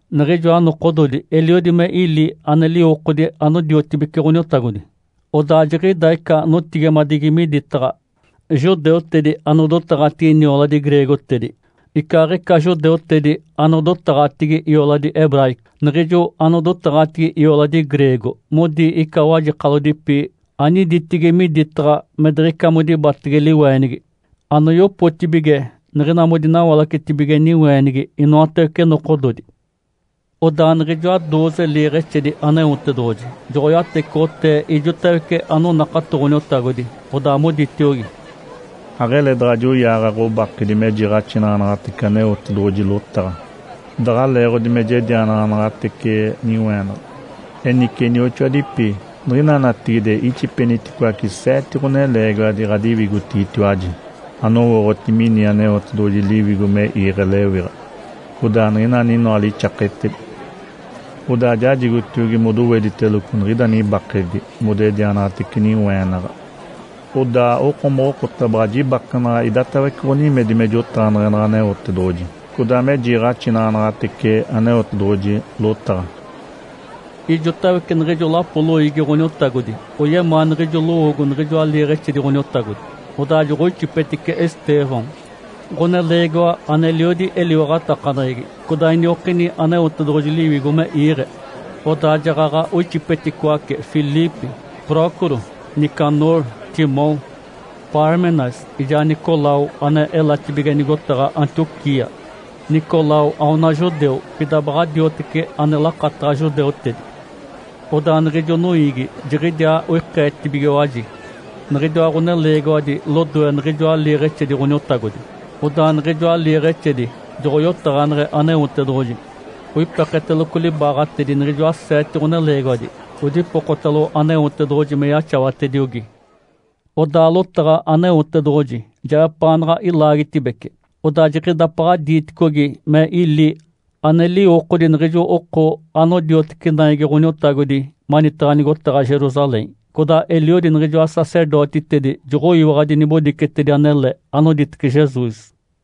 Niɡ̶ijoa nokododi eliodi me ili ane liwokodi anodiotibece Ǥoniotagodi. Odaa jiɡ̶ida ica notigimadigi miditaɡ̶a judeutedi anodotaɡ̶atigi nioladi greegotedi icaaɡ̶ica judeutedi anodotaɡ̶atigi ioladi hebraico. Niɡ̶ijo anodotaɡ̶atigi ioladi greego modi ica wajekalodipi aniditigi miditaɡ̶a me diɡ̶ica modibatege liweenigi anoyopotibige niɡ̶ina modinawalacetibige niweenigi inoatawece nokododi. Odaa niɡ̶ijoa dooze liiɡ̶exedi Aneotedoɡ̶oji joɡ̶oyatecoɡ̶otee ijotawece anonakato Ǥoniotagodi, odaa moditiogi, “Aɡ̶ele daɡ̶a joyaaɡ̶a ɡ̶obakedi me jiiɡ̶axinaɡ̶anaɡ̶atece Aneotedoɡ̶oji lotaɡ̶a daɡ̶a leeɡ̶odi me jedianaɡ̶anaɡ̶atece niweenaɡ̶a. Enice, inioxoadipi, niɡ̶ina natigide ixipeniticoace seete ɡ̶oneleegiwadi ɡ̶adiwigotigitiwaji anowooɡ̶oti mini Aneotedoɡ̶oji Liwigo me iiɡ̶e lewiɡ̶a, codaa niɡ̶ina aninoa lixaketedi. Odaa jajicaɡ̶atiogi modowediteloco niɡ̶ida nibakedi modedianaɡ̶atece niweenaɡ̶a. Odaa okomoɡ̶oko baɡ̶a jibakenaɡ̶a idatawece ɡ̶onimedi me jotaɡ̶aneɡ̶enaɡ̶a Aneotedoɡ̶oji codaa me jiiɡ̶axinaɡ̶anaɡ̶atece Aneotedoɡ̶oji lotaɡ̶a.” Ijotawece niɡ̶ijo lapo loiigi Ǥoniotagodi oyemaa niɡ̶ijo lowoogo niɡ̶ijoa liiɡ̶exedi Ǥoniotagodi. Odaa joɡ̶oixipetice Estêvão, ɡ̶oneleegiwa aneliodi eliwaɡ̶atakaneɡ̶egi, codaa iniokini Aneotedoɡ̶oji Liwigo me iiɡ̶e. Odaa jaɡ̶aɡ̶a oixipeticoace Filipe, Prócoro, Nicanor, Timom, Pármenas, ijaa Nicolau ane elatibige nigotaɡ̶a Antioquia. Nicolau aona judeu, pida baɡ̶a dioteci ane lakataɡ̶a judeutedi. Odaa niɡ̶ijo noiigi jiɡ̶idiaa oikeetibigiwaji niɡ̶idiwa ɡ̶oneleegiwadi lodoe niɡ̶ijoa liiɡ̶exedi Ǥoniotagodi, odaa niɡ̶ijoa liiɡ̶exedi joɡ̶oyotaɡ̶aneɡ̶e Aneotedoɡ̶oji, oipeketeloco libaaɡ̶atedi niɡ̶ijoa seete ɡ̶oneleegiwadi, odipokotalo Aneotedoɡ̶oji me yaxawatediogi. Odaa lotaɡ̶a Aneotedoɡ̶oji jeɡ̶epaanaɡ̶a ilaagitedibece. Odaa jiɡ̶idapaɡ̶a diiticogi me ili ane liwokodi niɡ̶ijo oko anodiotece naigi Ǥoniotagodi manitaɡ̶a nigotaɡ̶a Jerusalém. Codaa eliodi niɡ̶ijoa sacerdotitedi joɡ̶oyiwaɡ̶adi nibodicetedi anele anoditece Jesus.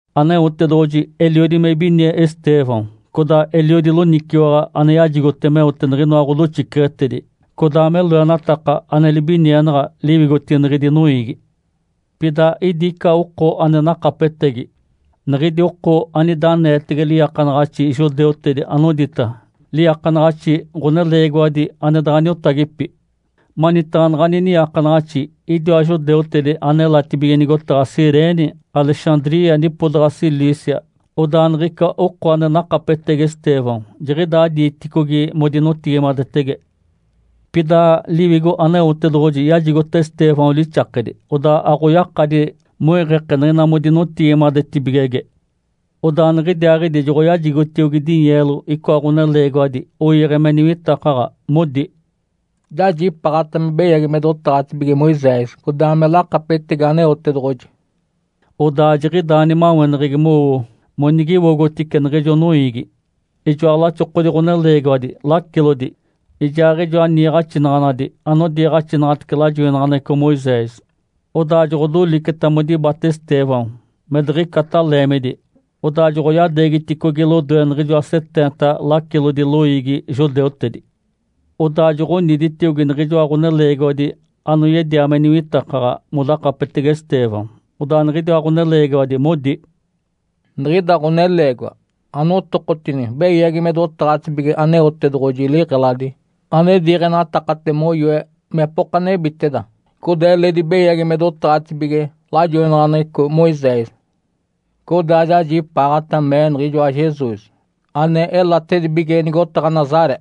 Aneotedoɡ̶oji eliodi me ibinie Estêvão codaa eliodi loniciwaɡ̶a ane yajigoteta meote niɡ̶inoa ɡ̶odoxiceɡ̶etedi codaa me loenataka ane libinienaɡ̶a liwigotigi niɡ̶idi noiigi. Pida idi ica oko ane nakapetegi, niɡ̶idi oko anida aneetege liiakanaɡ̶axi judeutedi anodita “Liiakanaɡ̶axi ɡ̶oneleegiwadi ane daɡ̶a niotagipi”. Manitaɡ̶a naɡ̶ani niiakanaɡ̶axi idiwa judeutedi ane elatibige nigotaɡ̶a Cirene, Alexandria, nipodaɡ̶a Cilícia codaa me Ásia. Odaa niɡ̶ica oko ane nakapetegi Estêvão jiɡ̶idaa diiticogi modinotigimadetege. Pida Liwigo Aneotedoɡ̶oji yajigota Estêvão lixakedi, odaa aɡ̶oyakadi moiɡ̶eke niɡ̶ina modinotigimadetibigege. Odaa niɡ̶idiaaɡ̶idi joɡ̶oyajigotiogi dinyeelo icoa ɡ̶oneleegiwadi oiiɡ̶e me niwitakaɡ̶a, modi, “Jajipaaɡ̶ata me beyagi me dotaɡ̶atibige Moisés codaa me lakapetegi Aneotedoɡ̶oji.” Odaa jiɡ̶idaa nimaweneɡ̶egi mowo monigiwogotice niɡ̶ijo noiigi, ijoa laxokodi ɡ̶oneleegiwadi lacilodi, ijaaɡ̶ijoa niiɡ̶axinaɡ̶anadi anodiiɡ̶axinaɡ̶atece lajoinaɡ̶aneɡ̶eco Moisés. Odaa joɡ̶odoliceta modibata Estêvão me diɡ̶icata leemidi, odaa joɡ̶oyadeegiticogi lodoe niɡ̶ijoa seteenta lacilodi loiigi judeutedi. Odaa joɡ̶oniditiogi niɡ̶ijoa ɡ̶oneleegiwadi anoyedia me niwitakaɡ̶a modakapetege Estêvão, odaa niɡ̶idiwa ɡ̶oneleegiwadi modi, “Niɡ̶ida ɡ̶oneleegiwa anotokotini beyagi me dotaɡ̶atibige Aneotedoɡ̶oji liɡ̶eladi ane diiɡ̶enatakate moyoe mepoka nebiteda, codaa eledi beyagi me dotaɡ̶atibige lajoinaɡ̶aneɡ̶eco Moisés. Codaa jajipaaɡ̶ata mee niɡ̶ijoa Jesus ane elatedibige nigotaɡ̶a Nazaré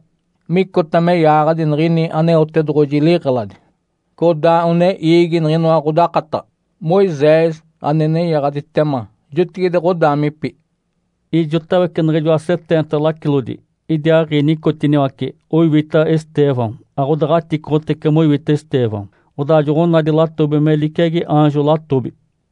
micota me yaaɡ̶adi niɡ̶ini Aneotedoɡ̶oji liɡ̶eladi codaa one iigi niɡ̶inoa ɡ̶odakataɡ̶a Moisés ane nenyaɡ̶aditema jotigide ɡ̶odaamipi.” Ijotawece niɡ̶ijoa seteenta lacilodi idiaaɡ̶i nicotiniwace, oiwita Estêvão. Aɡ̶odaɡ̶aticoɡ̶otece moiwita Estêvão, odaa joɡ̶onadi latobi me liciagi aanjo latobi.